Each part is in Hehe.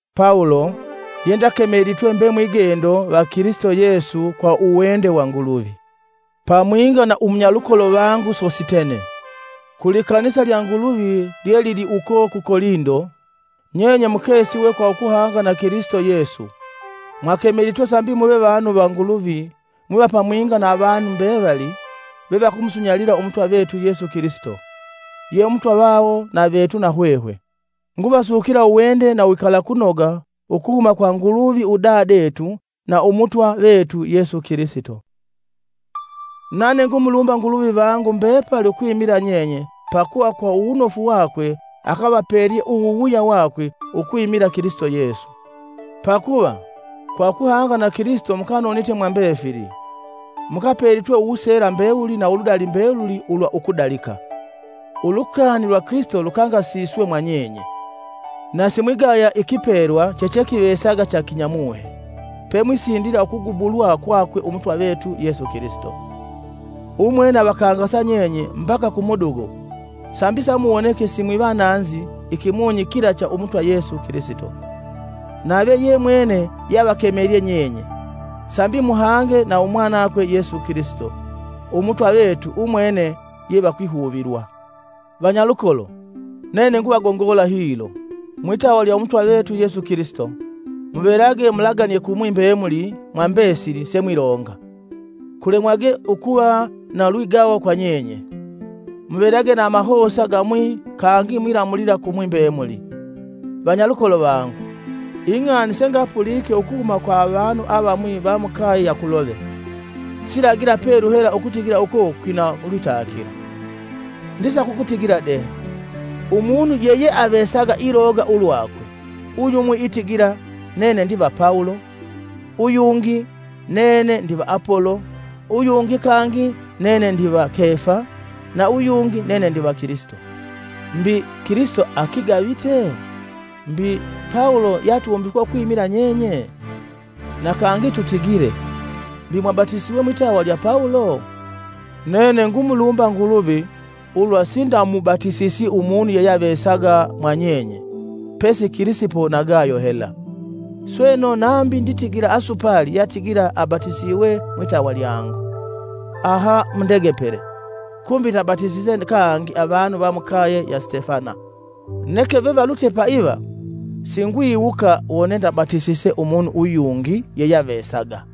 Pawulo, yendakemelitwe mbe mwigendo va Kilisito Yesu kwa uwende wa Nguluvi, pamwinga na umunyalukolo vangu Sositene, Kulikanisa lya Nguluvi lyelili uko ku Kolindo. Nyenye mukesiwe kwa ukuhanga na Kilisito Yesu, mwakemelitwe sambi muve vanu va Nguluvi mwiva pamwinga na avanu mbevali, vevakumusunyalila Umutwa vetu Yesu Kilisito, ye Umutwa vawo na vetu na hwehwe. Nguvasukila uwende na uwikalakunoga ukuhuma kwa Nguluvi udadetu na Umutwa vetu Yesu Kilisito. Nane ngumulumba Nguluvi vangu mbepali ukwimila nyenye pakuva kwa uwunofu wakwe akavapelye uwuwuya wakwe ukwimila Kilisito Yesu. Pakuva, kwa ukuhanga na Kilisito mukanonite mwa mbefili. Mukapelitwe uwuseela mbewuli na uludali mbeluli ulwa ukudalika, Ulukani lwa Kilisito lukangasiswe mwanyenye, na simwigaya ikipelwa chechekivesaga cha kimuhe, pemwisindila ukugubulwa kwakwe Umutwa vetu Yesu Kilisito. Umwene avakangasa nyenye mbaka kumudugo sambi samuwoneke simwivananzi ikimunyi kila cha Umutwa Yesu Kilisito. Nave yemwene yeavakemelye nyenye, sambi muhange na umwanakwe Yesu Kilisito Umutwa vetu umwene ye vakwihuvilwa. Vanyalukolo, nene nguvagongola hilo, mwitawa lya Umutwa vetu Yesu Kilisito: muvelage mulaganie kumwi mbemuli mwa mbesili semwilonga, kulemwage ukuva na ulwigawo kwa nyenye; muvelage na amahosa gamwi kangi mwilamulila kumwi mbemuli. Vanyalukolo vangu, ing'ani sengapulike ukuhuma kwa avanu avamwi va mukaye ya Kulove, silagila pelu hela ukutigila uko kwina lwitakilo. Ndisaka ukutigila de: umunu yeyeavesaga ilonga ulwakwe: uyumwi itigila, “Nene ndiva Pawulo,” Uyungi: “Nene ndiva Apolo,” uyungi kangi: “Nene ndiva Kefa,” na uyungi: “Nene ndiva Kilisito.” Mbi, Kilisito akigavite? Mbi, Pawulo yeatumbikwe ukwimila nyenye? Na kangi tutigile, mbi mwabatisiwe mwitawa lya Pawulo? Nene ngumulumba Nguluvi ulwa sindamubatisisi umunu yeyeavesaga mwa nyenye pesi Kilisipo na Gayo hela. Sweno nambi nditigila asupali yeatigila akabatisiwe mwitawa lyangu. ( Aha mundegepele, kumbi ndabatisise kangi avanu va mukaye ya Sitefana; neke vevalutye paiva, singwiwuka wone ndabatisise umunu uyungi yeyeavesaga.)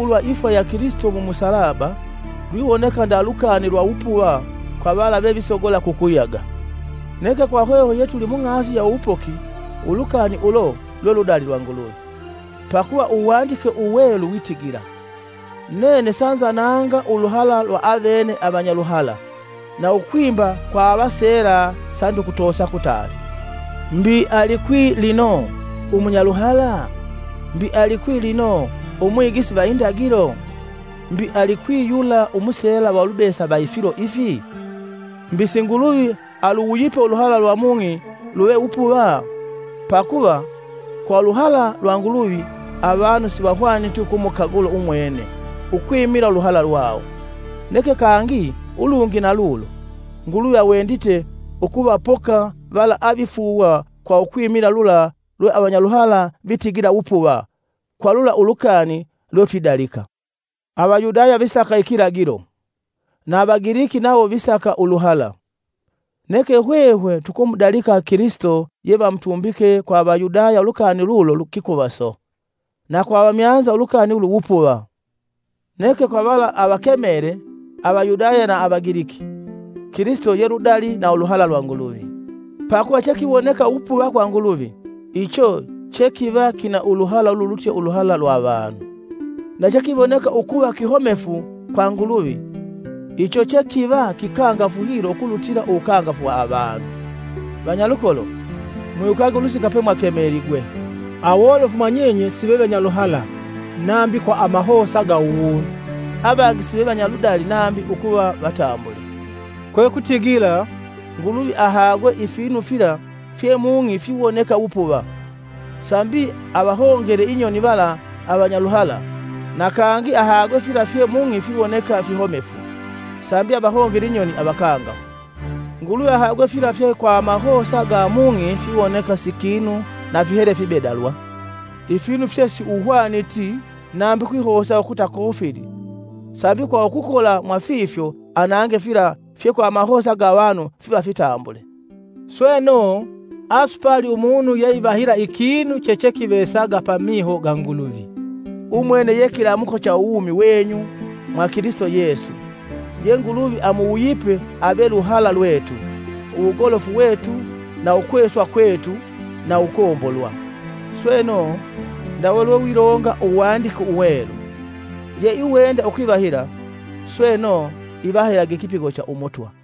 Pakuva ulukani ulwa ifwa ya Kilisito mu musalaba, lwiwoneka nda lukani lwa wupuva kwa vala vevisogola kukuyaga, neke kwa hwehwe yetuli mung'asi ya uwupoki ulukani ulo, lwe ludali lwa Nguluvi. Pakuva Uwandike Uwelu witigila: “Nene sanzananga uluhala lwa avene avanyaluhala. na ukwimba kwa avaseela sandikutosa kutali.” Mbi alikwi lino, umunyaluhala? Mbi alikwi lino, umwigisi va indagilo? Mbi alikwi yula umuseela va ulubesa va ifilo ifi mbi alikwi? Mbi si Nguluvi aluwuyipe uluhala lwa mung'i luve wupuva? Pakuva, kwa uluhala lwa Nguluvi avanu sivahwaniti ukumukagula umwene ukwimila uluhala lwawo. Neke kangi ulungi na ulo, Nguluvi awendite ukuvapoka vala avifuuwa kwa ukwimila lula lwe avanyaluhala vitigila wupuva, kwa lula ulukani lwetwidalika. Avayudaya visaka ikilagilo, na Avagiliki nawo visaka uluhala, Neke hwehwe tukumudalika Kilisito yevamutumbike Vamutumbike: Vamutovelye na imisumali. Kwa Avayudaya ulukani lulu kikuvaso, na kwa Avamyanza ulukani ulu wupuva. Neke kwa vala avakemele, Avayudaya na Avagiliki, Kilisito ye uludali na uluhala lwa Nguluvi. Pakuva chekiwoneka wupuva kwa Nguluvi, icho chekiva kina uluhala ululutye uluhala lwa avanu, na chekiwoneka ukuva kihomefu kwa Nguluvi, icho chekiva kikangafu hilo ukulutila uwukangafu wa avanu. Vanyalukolo, mwiwukage ulusika pemwakemeligwe: Awolofu mwanyenye sive vanyaluhala nambi kwa amahosa ga uwunu; avangi sive vanyaludali nambi ukuva vatambule. Kwekutigila, Nguluvi ahagwe ifinu fila fye mung'i fiwoneka wupuva; sambi avahongele inyoni vala avanyaluhala na kangi ahagwe fila fye mung'i fiwoneka fihomefu, sambi avahongele inyoni avakangafu. Nguluvi ahagwe fila fye kwa amahosa ga mung'i fiwoneka si kinu na fihele fibedalwa, ifinu fye siuhwaniti nambi ukwihosa ukuta kofili sambi kwa ukukola mwa fifyo anange fila fye kwa amahosa ga avanu fiva fitambule. Sweno, asupali umunu yeivahila ikinu chechekivesaga pamiho ga Nguluvi. Umwene ye kilamuko cha uwumi wenyu mwa Kilisito Yesu ye Nguluvi amuwuyipe ave luhala lwetu, uwugolofu wetu na ukweswa kwetu na uwukombolwa. Sweno, ndawe lwewilonga Uwandike Uwelu: “Yeiwenda ukwivahila, sweno, ivahilage ikipigo cha Umutwa.”